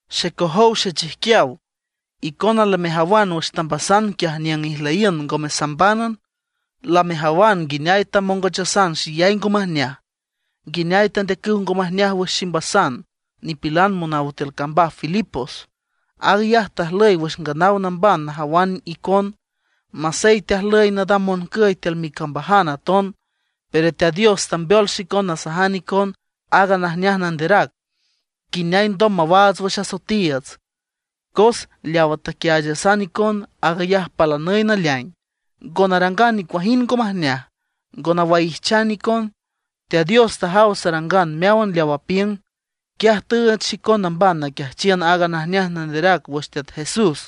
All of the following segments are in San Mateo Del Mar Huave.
Xecojow xechijquiaw, icona lamejawan wüx tambasan quiaj niüng ijlüyiün ngome sambánan. Lamejawan nguineay tamongochasan xeyay ngo majneaj, nguineay tandeacüw ngo majneaj wüx ximbasan nipilan monaw tiül cambaj Filipos. Aag ayaj tajlüy wüx nganaw namban najawan icon. Masey teajlüy nadam moncüy tiül micambajan aton, pero Teat Dios tambeol xicon nasajan icon aaga najneaj nanderac, nguineay alndom mawaats wüx asoetiiüts. Cos leawa taquiaachasan icon, aag ayaj palanüy naleaing; ngo narangan nicuajind ngo majneaj, ngo nawaijchan icon. Teat Dios tajaw sanarangan meáwan leaw apiüng, quiaj tüüch xicon namban naquiajchiün aaga najneaj nanderac wüx Teat Jesús.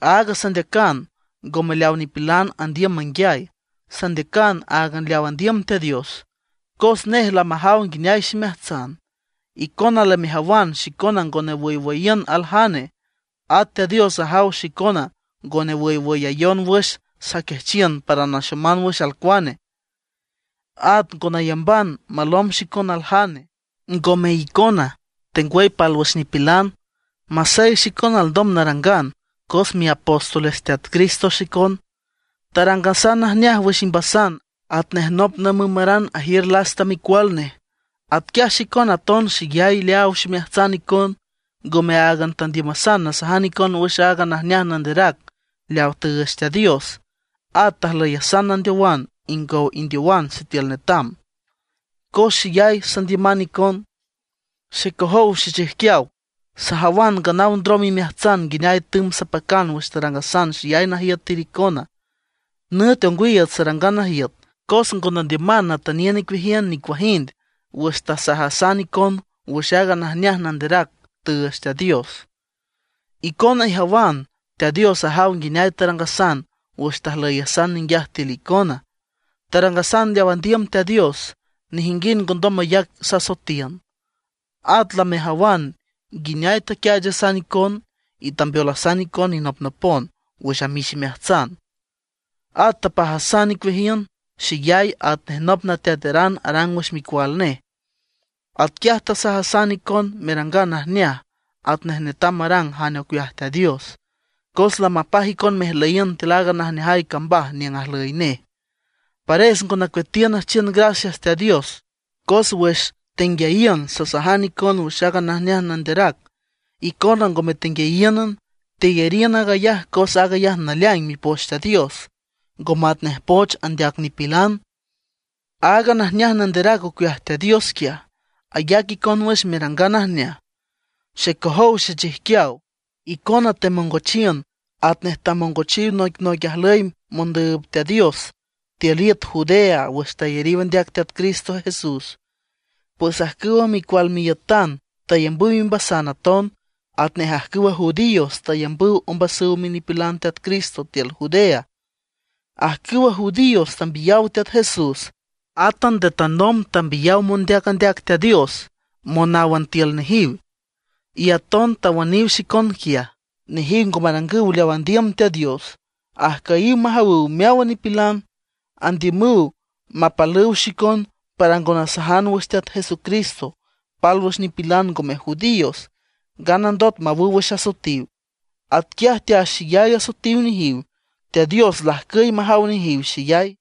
Aag sandeacan, ngome leaw nipilan andiüm manguiay, sandeacan áagan leaw andiüm Teat Dios, cos nej lamajaw nguineay ximeajtsan. Icona lamejawan xicona ngo nawüywüyiün aljane; at Teat Dios ajaw xicona ngo newüyayon wüx saquiajchiün para naxoman wüx alcuane. At ngo nayamban malomb xicon aljane, ngome icona tengwüy pálwüx nipilan. Masey xicona alndom narangan, cos miapóstoles Teat Cristo xicon. Tarangasan najneaj wüx imbasan, atnej nop namümaran ajiür lasta micual nej. Atquiaj xicona aton xeyay leaaw ximeajtsan icon. Ngome áagan tandiümasan nasajan icon wüx aaga najneaj nanderac leawa tüüch Teat Dios; at tajlüyasan nandeowan ingow indeowan sitiül netam, cos xeyay sandiüman icon. Xecojow xechijquiaw, sajawan nganaw ndrom imeajtsan nguineay tümb sapacan wüx tarangasan xeyay najiüt tiül icona. Nüt ongwiiüts sarangan najiüt cos ngo nandiüman natüniün icueajiün nicuajind wüx tasajasan icon wüx aaga najneaj nanderac tüüch Teat Dios. Icona ijawan, at Teat Dios ajaw nguineay tarangasan wüx tajlüyasan ninguiaj tiül icona. Tarangasan leaw andiüm Teat Dios, nejinguind ngondom mayac sasoetiün. At lamejawan nguineay taquiaachasan icon, y tambeolasan icon inopnopon wüx amix imeajtsan. At tapajasan icueajiün xeyay atnej nop nateataran arang wüx micual nej. Atquiaj tasajasan icon merangan najneaj, atnej netam marang jane ocueaj Teat Dios, cos lamapaj icon mejlüyiün tiül aaga najneajay cambaj niüng ajlüy nej. Pares ngo nacueatiün nüjchiün gracias Teat Dios, cos wüx tenguiayiün sasajan icon wüx aaga najneaj nanderac, icona ngome tenguiayíünan, teyariün aag ayaj cos aag ayaj naleaing Mipoch Teat Dios, ngo matnej poch andeac nipilan. Aaga najneaj nanderac ocueaj Teat Dios quiaj, ayac icon wüx merangan najneaj. Xecojow xechijquiaw, icona temongochiün atnej tamongochiw noicnoic ajlüy mondüüb Teat Dios tiül iüt Judea wüx tayariw andeac Teat Cristo Jesús. Pues ajcüw micual miiütan tayambüw imbasan aton, atnej ajcüwa judíos tayambüw ombasüw minipilan Teat Cristo tiül Judea. Ajcüwa judíos tambiyaw Teat Jesús. Átan nde tanomb tambiyaw mondeac andeac Teat Dios monáwan tiül nejiw; y aton tawüniw xicon quiaj. Nejiw ngo marangüw leaw andiüm Teat Dios, y ajcüyiw majawüw meáwan nipilan. Andiümüw mapalüw xicon para ngo nasajan wüx Teat Jesucristo pálwüx nipilan ngome judíos, nganandot mawüw wüx asoetiw. Atquiaj teaxeyay asoetiw nejiw; Teat Dios lajcüy majaw nejiw xeyay.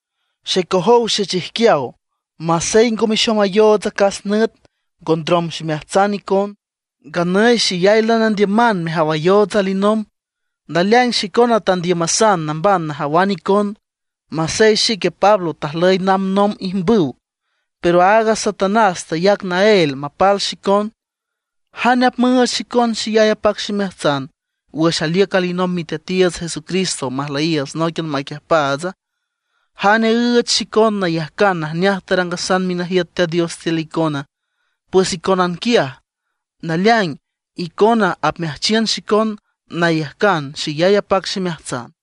Xecojow xechijquiaw, masey ngo mexomayoots acas nüt, ngo ndrom ximeajtsan icon. Nganüy xeyay lanandiüman mejawayoots alinomb. Naleaing xicona tandiümasan namban najawan icon. Masey xique Pablo tajlüy namb nomb ijmbüw, pero aaga Satanás tayac naél mapal xicon. ¿Jane apmüüch xicon xeyay apac ximeajtsan wüx aliüc alinomb Miteatiiüts Jesucristo majlüyiiüts nóiquian maquiüjpaatsa? ¿Jane üüch xicon nayajcan najneaj tarangasan minajiüt Teat Dios tiül icona? Pues iconan quiaj. Naleaing, icona apmeajchiün xicon nayajcan xeyay apac ximeajtsan.